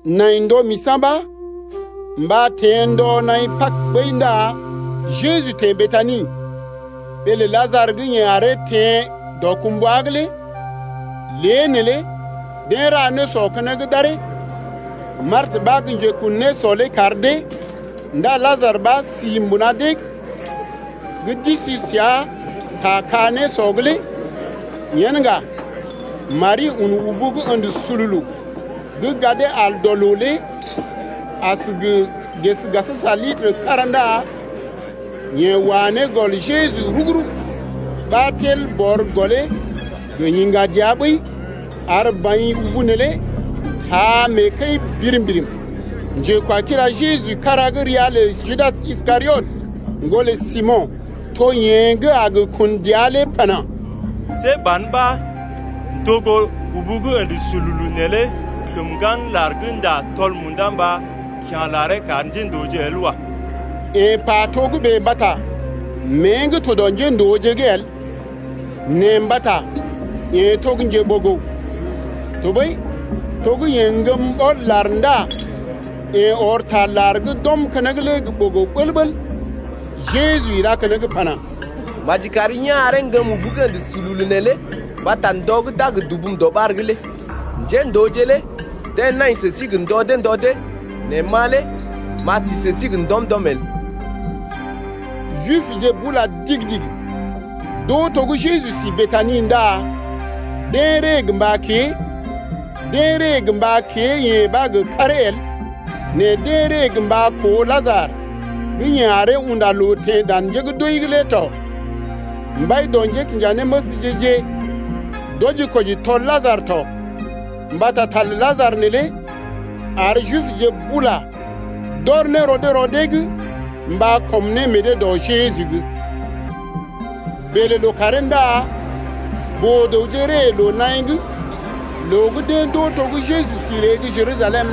Nai ndɔ misa̰ ɓa mba teḛ ndɔ naḭ Pag ɓəi ndá Jeju teḛ Betani, ɓee lə Lajarə gə́ yeḛ aree teḛ dɔkumbwa’g lé. Lée neelé deḛ ra nésɔ keneŋ d’aree, Martə ɓa gə́ njekun nésɔ lé kar dee ndá Lajarə ɓa si mbuna deḛ gə́ d’isi səa ta ka-nésɔ’g lé. Yen ŋga Mari un ubu gə́ ə̰də sululu gə́ gadee al dɔ loo lé as gə ges litər kára ndá yeḛ wa ne gɔl Jeju rugu-rugu ɓa tel bɔr gɔlee gə yiŋga dəa ɓəi ar baḭ ubu neelé taa mee kəi birim-birim. Njekwakila Jeju gə́ kára ria lə Judas Iskariot, ŋgolə Simo̰, to yeḛ gə́ a gə kun dəa lé pana: See ban ɓa ndogo ubu gə́ ə̰də sululu neelé kəm ŋgan lar gə́ ndá tɔl munda mba kya̰ laree kar njéndooje el wa. Yeḛ pa togə́bè mbata mée gə́ to dɔ njéndooje’g lé el nɛ mbata yeḛ to njeɓogo tɔɓəi to gə́ yeḛ ŋgəm ɓɔl-lar ndá yeḛ ɔr ta lar gə́ d’ɔm keneŋ lé gə ɓogo ɓəl-ɓəl. Jeju ilá keneŋ pana: Maji kari yá̰ aree ŋgəm ubu gə́ ə̰də sululu neelé mbata ndɔ gə́ d’a gə dubum dɔɓar’g lé. Njéndooje lé deḛ nai sə sí gə ndɔ dee ndɔ dee nɛ ma lé m’a si sə sí gə ndɔm-ndɔm el. Jibje bula digi-digi d’oo to gə́ Jeju sí Betani ndá deḛ ree gə mba kée, deḛ ree gə mba kée-yeḛ ɓa gə karee el, nɛ deḛ ree gə mba koo Lajarə gə́ yeḛ aree unda loo teḛ dan njé gə́ d’wəi’g lé tɔ. Mbai dɔ njékinjanéməsje-je d’wɔji-kwɔji tɔl Lajarə tɔ, mbata ta lə Lajarə neelé ar Jibje bula d’ɔr ne rɔ dee rɔ dee’g mba kɔm ne meḛ dee dɔ Jeju’g. Bèlè lookàree ndá boo-dəwje gə́ ree loo-naḭ’g loo gə́ deḛ d’oo to gə́ Jeju sí ree gə́ Jerusalem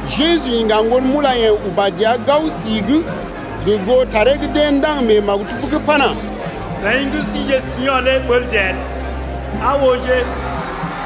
Jeju iŋga ŋgon mulayḛ̀je uba dəa gao si’g gə goo taree gə́ deḛ ndaŋg mee maktub’g pana: Seḭ gə́ sije Sio̰ lé ɓəlje el, Aa ooje,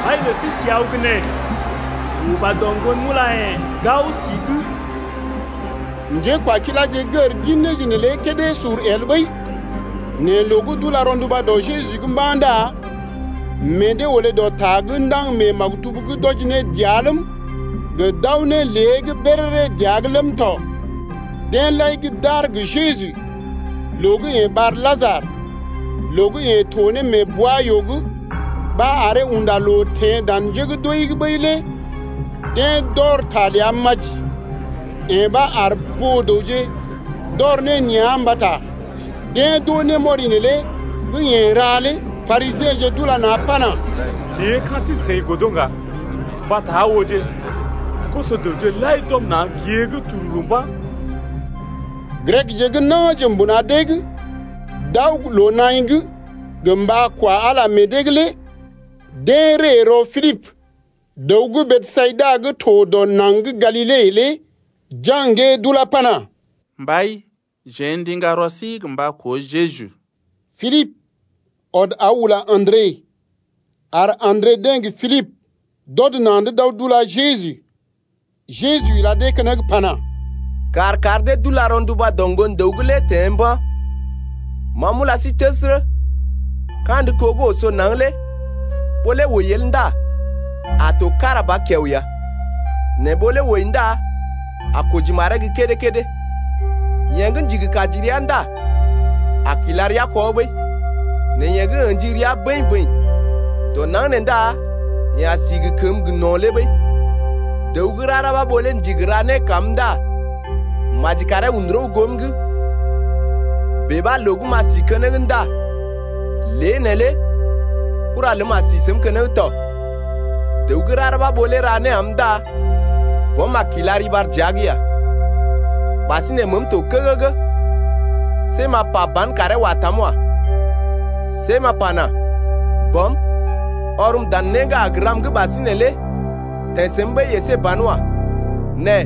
mbai lə sí si aw gə́ nee. Yeḛ uba dɔ ŋgon mulayḛ̀je gao si’g. Njékwakiláje gər gin néje neelé kédé sur el ɓəi. Nɛ loo gə́ d’ula rɔnduba Jeju’g mba̰ ndá meḛ dee olé dɔ ta gə́ ndaŋg mee maktub’g d’wɔji ne dəa ləm, gə d’aw ne lée’g béréré dəa’g ləm tɔ. Deḛ lai gə́ d’aar gə Jeju loo gə́ yeḛ ɓar Lajarə loo gə́ yeḛ to mee bwa-yoo’g ɓa aree unda loo teḛ dan njé gə́ d’wəi’g ɓəi lé deḛ d’ɔr ta ləa maji. Yee ɓa ar boo-dəwje d’ɔr ne nea̰ mbata deḛ d’oo némɔri neelé gə́ yeḛ ra lé. Parisiḛje d’ula na̰ pana: Lée ka̰ sí-seḭ godo ŋga, mbata aa ooje, koso-dəwje lai d’ɔm na̰ gée’g tururu mba̰. Grekje gə́ na̰je mbuna deḛ gə́ d’aw gə́ loo-naḭ’g mba kwa Ala meḛ dee’g lé deḛ ree rɔ Pilibə’g, dəw gə́ Besayida gə́ to dɔ naŋg gə́ Galile lé jaŋgee d’ulá pana: Mbai, jeḛ ndiŋga rɔ sí gə mba koo Jeju. Pilibə ɔd aw ula Andre, ar Andre deḛ gə Pilibə d’ɔd na̰’d d’aw d’ula Jeju. Jeju ila dee keneŋ pana: Kàr kar dee d’ula rɔnduba dɔ Ŋgon-dəw’g lé teḛ mba̰. Ma m’ula sí təsərə, kandə kó gə́ oso naŋg lé ɓó lé wəi el ndá a to kára ba kiao ya, nɛ ɓó lé wəi ndá a koji maree gə́ kédé-kédé. Yeḛ gə́ ndigi kaji rəa ndá a kila rəa kɔ ɓəi. Nɛ yeḛ gə́ ə̰ji rəa bəḭ-bəḭ dɔ naŋg nee ndá yeḛ a si gə kəməgə́ gə no̰ lé ɓəi. Dəw gə́ rara ɓa ɓó lé ndigi ra né kam ndá maji karee un rəw goom’g, bèe ɓa loo gə́ m’a si keneŋ ndá lé neelé kura ləm a si səm keneŋ tɔ. Dəw gə́ rara ɓa ɓó lé ra né am ndá Bɔm a kila riɓar dəa’g ya. Ɓasinè məəm to kəgəgə. See m’a pa ban karee wa tam wa. See m’a pana: Bɔm, ɔrm dan né gə́ a gə ram’g ɓasinè lé teḛ səm ɓəi əsé ban wa. Nɛ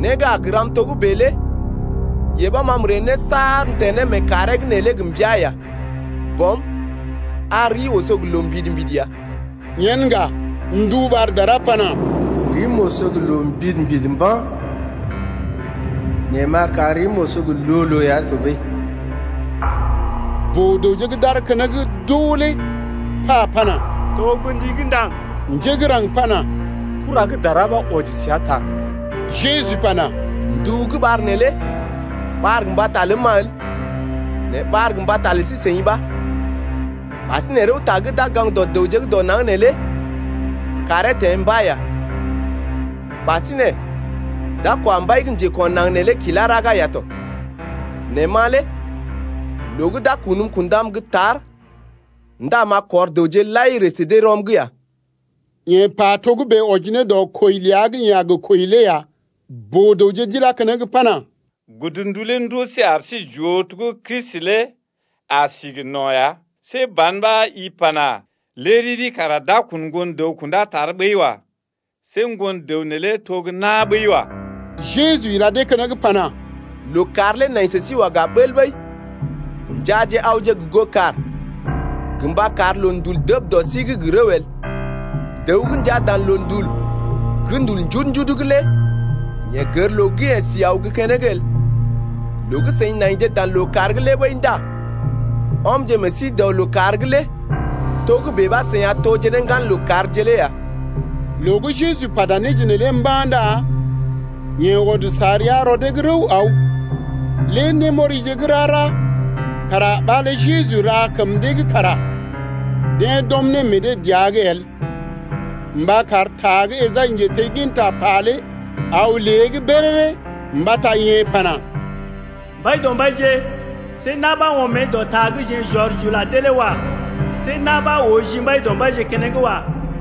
né gə́ a gə ram togə́bè lé yee ɓa ma m’ree ne saar m’teḛ ne mee kàree’g neelé gə mbəa ya. Bɔm, ar rii oso gə loo mbidi-mbidi ya! Yen ŋga ndu ɓar dara pana: Rim oso gə loo mbidi-mbidi mba̰, nɛ m’a kar rim oso gə loo-loo ya tɔɓəi. Boo-dəwje gə́ d’aar keneŋ d’oo lé pa pana: To gə́ ndi gə́ ndaŋg. Njé gə́ raŋg pana: Kura gə́ dara ɓa wɔji səa ta. Jeju pana: Ndu gə́ ɓar neelé ɓar gə mbata ləm-ma el, nɛ ɓar gə mbata lə sí-seḭ ɓa. Ɓasinè rəwta gə́ d’a gə gaŋg dɔ dəwje dɔ naŋg neelé kàree teḛ mba̰ ya. Ɓasinè d’a kwa mbai gə́ njeko̰ naŋg neelé kilá raga ya tɔ. Nɛ ma lé loo gə́ d’a kunm kundam gə́ tar ndá m’a kɔr dəwje lai ree sə dee rɔm’g ya. Yeḛ pa togə́bè wɔji ne dɔ kwəi ləa gə́ yeḛ a gə kwəi lé ya. Boo-dəwje d’ilá keneŋ pana: Godndu lé ndoo sí ar sí j’oo to gə́ Kristi lé a si gə no̰ ya. See ban ɓa i pana: Lé riri kara d’a kun Ŋgon-dəw kundá tar ɓəi wa. See Ŋgon-dəw neelé to gə́ na̰ ɓəi wa. Jeju ila dee keneŋ pana: Lookàr lé nai sə sí waga bəl ɓəi. Njaaje awje gə goo kàr gə mba kar loondul dəb dɔ sí’g gə rəw el. Dəw gə́ njaa dan loondul gə́ ndul njudu-njudu’g lé yeḛ gər loo gə́ yeḛ si aw gə́ keneŋ el. Loo gə́ seḭ naije dan lookàr’g lé ɓəi ndá ɔmje meḛ sí dɔ lookàr’g lé togə́bè ɓa seḭ a toje ne ŋgan lookàrje lé ya. Loo gə́ Jeju pata néje neelé mba̰ ndá yeḛ ɔd sa rəa rɔ dee’g rəw aw. Lé némɔrije gə́ rara kara ɓa lé Jeju ra kəm dee’g kara deḛ d’ɔm ne meḛ dee dəa’g el mba kar ta gə́ Esai njetegginta pa lé aw lée’g béréré, mbata yeḛ pana: Mbaidɔmbaije, see na̰ ɓa ɔm mée dɔ ta gə́ jeḛ j’ɔr j’ula dee lé wa. See na̰ ɓa oo ji Mbaidɔmbaije keneŋ wa.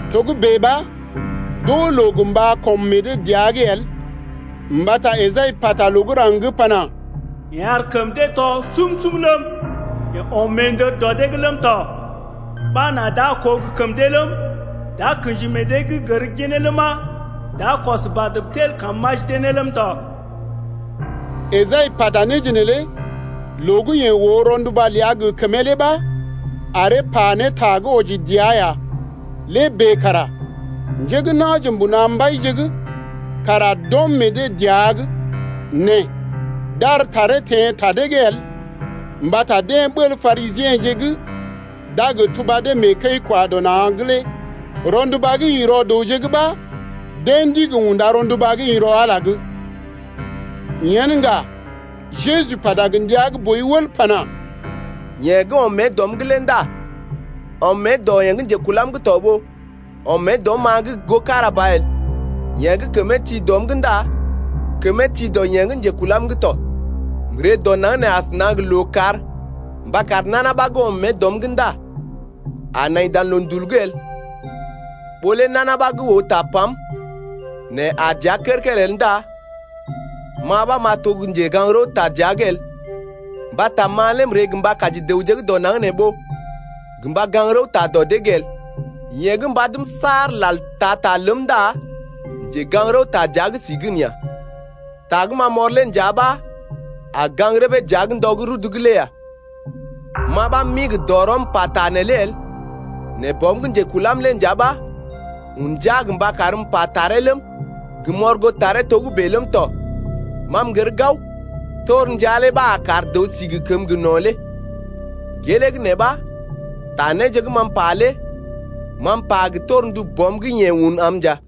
Togə́bè ɓa d’oo loo gə mba kɔm meḛ dee dəa’g el, mbata Esai pata loo gə́ raŋg’g pana: Yeḛ ar kəm dee tɔ sum-sum ləm, Yeḛ ɔm meendər dɔ dee’g ləm tɔ, Ɓa nà d’a koo gə kəm dee ləm, D’a kḛji meḛ dee’g gər ginee ləma, D’a kɔs badm tel kam m’aji dee ləm tɔ. Esai pata néje neelé loo gə́ yeḛ oo rɔnduba ləa gə kəmee lé ɓa aree pa ne ta gə́ wɔji dəa ya. Lé bèe kara njé gə́ na̰je mbuna mbaije’g kara d’ɔm meḛ dee dəa’g. Nɛ d’ar taree teḛ ta dee’g el mbata deḛ ɓəl Parisiḛje gə́ d’a gə tuba dee mee kəi-kwa-dɔ-na̰’g lé. Rɔnduba gə́ ḭ rɔ dəwje’g ɓa deḛ ndigi unda rɔnduba gə́ ḭ rɔ Ala’g lé. Yen ŋga Jeju pata gə ndia gə́ boi wəl pana: Yeḛ gə́ ɔm mée dɔm’g lé ndá ɔm mée dɔ yeḛ gə́ njekulam’g to ɓó ɔm mée dɔm-ma’g goo kára ba el. Yeḛ gə́ kəmee ti dɔm’g ndá kəmee ti dɔ yeḛ gə́ njekulam’g tɔ. M’ree dɔ naŋg nee asəna gə lookàr mba kar nana ɓa gə́ ɔm mée dɔm’g ndá a nai dan loondul’g el. Ɓó lé nana ɓa gə́ oo tapam, nɛ aa dəa kər-kər el ndá ma ɓa m’a to gə́ njegaŋ-rəwta dəa’g el, mbata ma lé m’ree gə mba kaji dəwje gə́ dɔ naŋg nee ɓó gə mba gaŋg rəwta dɔ dee’g el. Yeḛ gə́ mbadm saar lal taa ta ləm ndá njegaŋ-rəwta dəa’g si gən ya. Ta gə́ ma m’ɔr lé nja ɓa a gaŋg rəbee dəa’g ndɔ gə́ rudu’g lé ya. Ma ɓa m’ḭ gə dɔrɔm m’pata neelé el, nɛ Bɔm gə́ njekulam lé nja ɓa un ndia gə mba karm m’pa taree ləm, gə m’ɔr goo taree togə́bè ləm tɔ. Ma m’gər gao torndia lé ɓa a kar dəw si ne gə kəməgə́ gə no̰ lé. Gelee gə́ nee ɓa ta néje gə́ ma m’pa lé ma m’pa gə torndu Bɔm gə́ yeḛ un am nja.